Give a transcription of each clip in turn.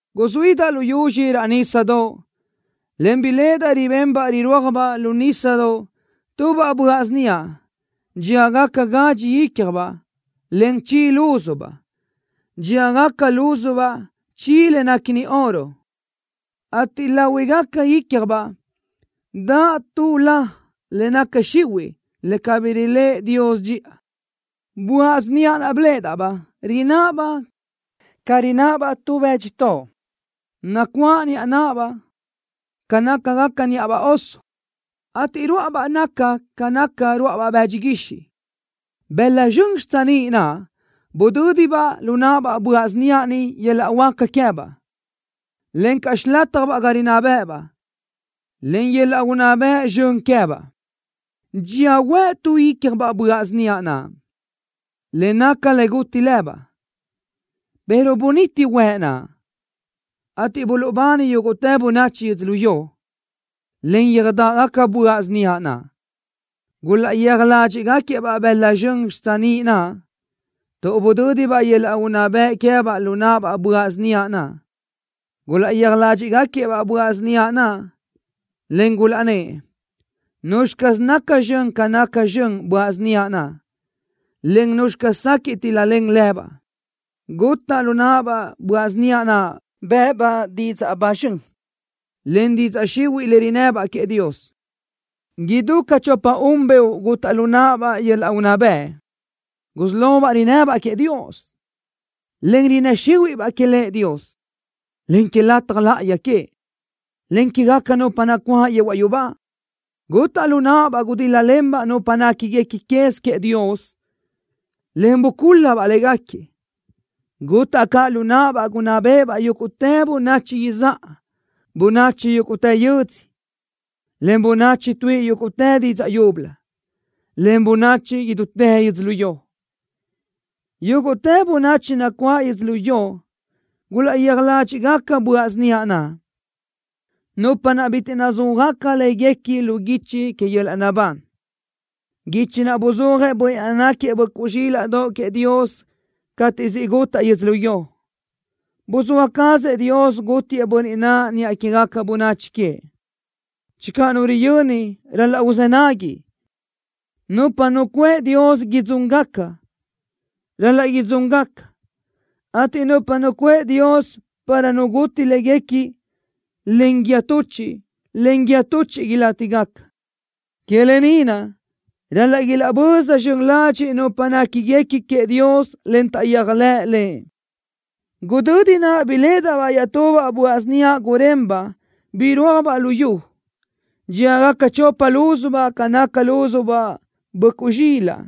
Guzuídaʼ lu yuzxi raʼ nísadoʼ, en biléʼedaʼ ribenbaʼ rirúajbaʼ lu nísadoʼ tubaʼ böaʼ síniaʼ dxíagaca gadxi ícjabaʼ, en chi lúzubaʼ. Dxíagaca lúzubaʼ chi le néquini oro, ateʼ láhuigaca ícjabaʼ daʼ tu la le naca xihuiʼ le cabí riléʼe Dios dxiʼa. Böaʼ síniaʼ naʼ biléʼedaʼ-baʼ rináʼabaʼ ca nácabaʼ tu bë́dxitoʼ, nacuáʼ níʼabaʼ ca nácagaca níʼabaʼ oso, ateʼ ruáʼabaʼ naca ca naca ruáʼabaʼ bëdxi guixiʼ. Bëla zxön xitsiníʼ naʼ budö́dibaʼ lu naʼabaʼ böaʼ síniaʼ ni yöl-laʼ huáca queë́baʼ, encaʼ xilátjabaʼ ga rinná bë́ʼëbaʼ, en yöl-laʼ unná bëʼ zxön queë́baʼ. Dxía huëʼ tu ícjabaʼ böaʼ síniaʼ naʼ, le naca le guti lëbaʼ, pero buniti huëʼ naʼ, ateʼ buluʼbani yúguʼtë bönachi yödzölió, en yöjdáʼgaca böaʼ síniaʼ naʼ. Gulaʼyéaj ládxiʼgaquiëʼ-baʼ bëla zxön xitsiníʼ naʼ, tuʼ budö́dibaʼ yöl-laʼ unná bëʼ queë́baʼ lu náʼabaʼ böaʼ síniaʼ naʼ. Gulaʼyéaj ládxiʼgaquiëʼ-baʼ böaʼ síniaʼ naʼ, en gulaʼnnë́ʼ: “¿Nuzxi caz naca zxön ca naca zxön böaʼ síniaʼ naʼ, en nuzxi caz sequiʼ tíl-lalen lëbaʼ?” Gutaʼ lu náʼabaʼ böaʼ síniaʼ naʼ bë́ʼëbaʼ didzaʼ ba zxön, en didzaʼ xihuiʼ le rinnëbaʼ queëʼ Dios. Idú ca chopa-un beoʼ gutaʼ lu náʼabaʼ yöl-laʼ unná bëʼ. Gusí lobaʼ rinnëbaʼ queëʼ Dios, en rinnë́ xíhuiʼbaʼ que Lëʼ Dios, en que lataj láʼayi queëʼ, en quégaca nupa nacuáʼ yehuaʼ yubá. Gutaʼ lu náʼabaʼ gudíl-lalenbaʼ nupa néquiguequi quez queëʼ Dios, en bucúl-labaʼ légaquiëʼ. Gutaʼ caʼ lu náʼabaʼ gunná béʼebaʼ yúguʼtë bönachi izáʼa, bönachi yúguʼtë yödzö, en bönachi tuíʼi yúguʼtë didzaʼ yúbölö, en bönachi idútë yödzölió. Yúguʼtë bönachi nacuáʼ yödzölió gulaʼyéaj ládxiʼgaca böaʼ síniaʼ naʼ, nupa naʼ bitiʼ nazúajgaca láguequi lu guichi que yöl-laʼ naʼbán, guichi naʼ buzúajëʼ Bönniʼ naʼ náquiëʼ Böʼcuʼ Zxílaʼdoʼ queëʼ Dios cateʼ siʼ gutaʼ yödzölió. Buzóa cazëʼ Dios gútiëʼ Bönniʼ naʼ niʼa quégaca bönachi queëʼ. Channö nu riyöni, ral-laʼ uzë́ nagui. Nupa nucuʼë Dios idzúngaca, ral-laʼ idzúngaca, ateʼ nupa nucuʼë Dios para nu guti léguequi len guíë tuchiʼ, len guíë tuchiʼ ilátigaca. Que lë ni naʼ, ral-laʼ ilaʼböza zxön ladxiʼ nupa néquiguequi queëʼ Dios, en taʼyéajlëʼ Lëʼ. Gudödi naʼ biléʼedaʼ-baʼ iaʼtubaʼ böaʼ síniaʼ gurenbaʼ birúajbaʼ lu yu. Dxíagaca chopa lúzubaʼ ca naca lúzubaʼ böʼcuʼ zxilaʼ,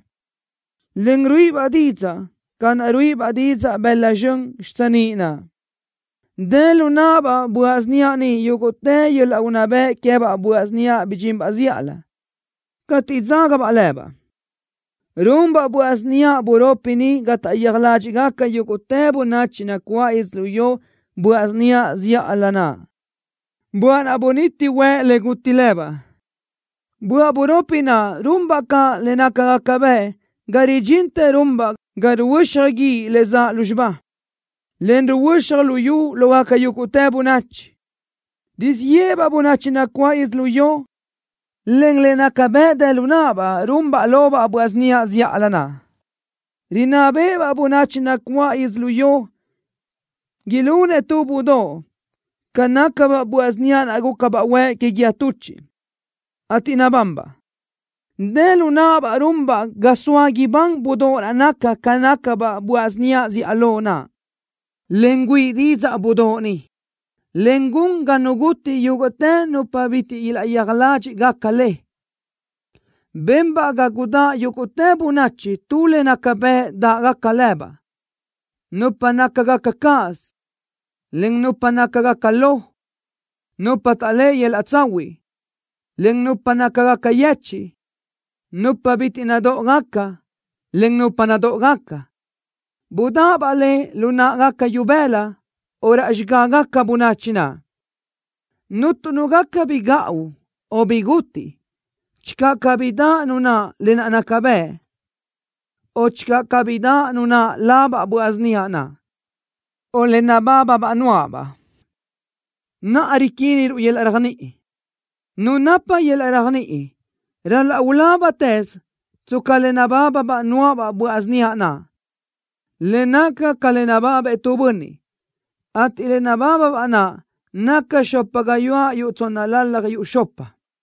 en ruíʼibaʼ didzaʼ ca naʼ ruíʼibaʼ didzaʼ bëla zxön xitsiníʼ naʼ. Dë lu náʼabaʼ böaʼ síniaʼ ni yúguʼtë yöl-laʼ unná bëʼ queë́baʼ böaʼ síniaʼ bidxinbaʼ zíʼalö, cateʼ dzágabaʼ lëbaʼ. Runbaʼ böaʼ síniaʼ buropi ni ga taʼyéaj ládxiʼgaca yúguʼtë bönachi nacuáʼ yödzölió böaʼ síniaʼ zíʼalö naʼ, böaʼ naʼ buniti huëʼ le guti lëbaʼ. Böaʼ buropi naʼ runbaʼ caʼ le nácagaca bëʼ ga ridxintë runbaʼ ga ruhuö́xaj guíʼ le zaʼ lúzxiba, en ruhuö́xaj luyú lógaca yúguʼtë bönachi. Rizíʼ yéʼebaʼ bönachi nacuáʼ yödzölió len le nácagaca bëʼ dë lu náʼabaʼ runbaʼ lobaʼ böaʼ síniaʼ zíʼalö naʼ. Rinná béʼebaʼ bönachi nacuáʼ yödzölió ilunëʼ tu budóʼ ca nácabaʼ böaʼ síniaʼ naʼ gúcabaʼ huëʼ que guíë tuchiʼ, ateʼ nabanbaʼ. Dë lu náʼabaʼ runbaʼ ga soa ibán budóʼ naʼ naca ca nácabaʼ böaʼ síniaʼ zíʼalö naʼ, en güíʼi didzaʼ budóʼ ni, en gun ga nu guti yúguʼtë nupa bitiʼ ilaʼyéaj ládxiʼgaca le. Benbaʼ ga gudáʼ yúguʼtë bönachi tu le naca bëʼ dáʼgaca lëbaʼ, nupa nácagaca cáʼasö, en nupa nácagaca lo, nupa taʼléʼe yöl-laʼ tsahuiʼ, en nupa nácagaca yechiʼ, nupa bitiʼ nadóʼogaca, en nupa nadóʼogaca. Budáʼabaʼ le lu náʼagaca ibëla o raʼ xigágaca bönachi naʼ. Cuntu nu gaca bi gaʼu o bi gutiʼ channö cabí daʼ nu naʼ lë naʼ naca bëʼ, o channö cabí daʼ nu naʼ labaʼ böaʼ síniaʼ naʼ, o le nabábabaʼ nuáʼabaʼ. Naʼa riquínnuʼ yöl-laʼ réajniʼi. Nu napa yöl-laʼ réajniʼi ral-laʼ ulábatëz tsca le nabábabaʼ nuáʼabaʼ böaʼ síniaʼ naʼ, le naca ca le nababëʼ tu bönniʼ, ateʼ le nabábabaʼ naʼ naca xopa gayuáʼ yuʼ tsónnalalaj yuʼ xopa.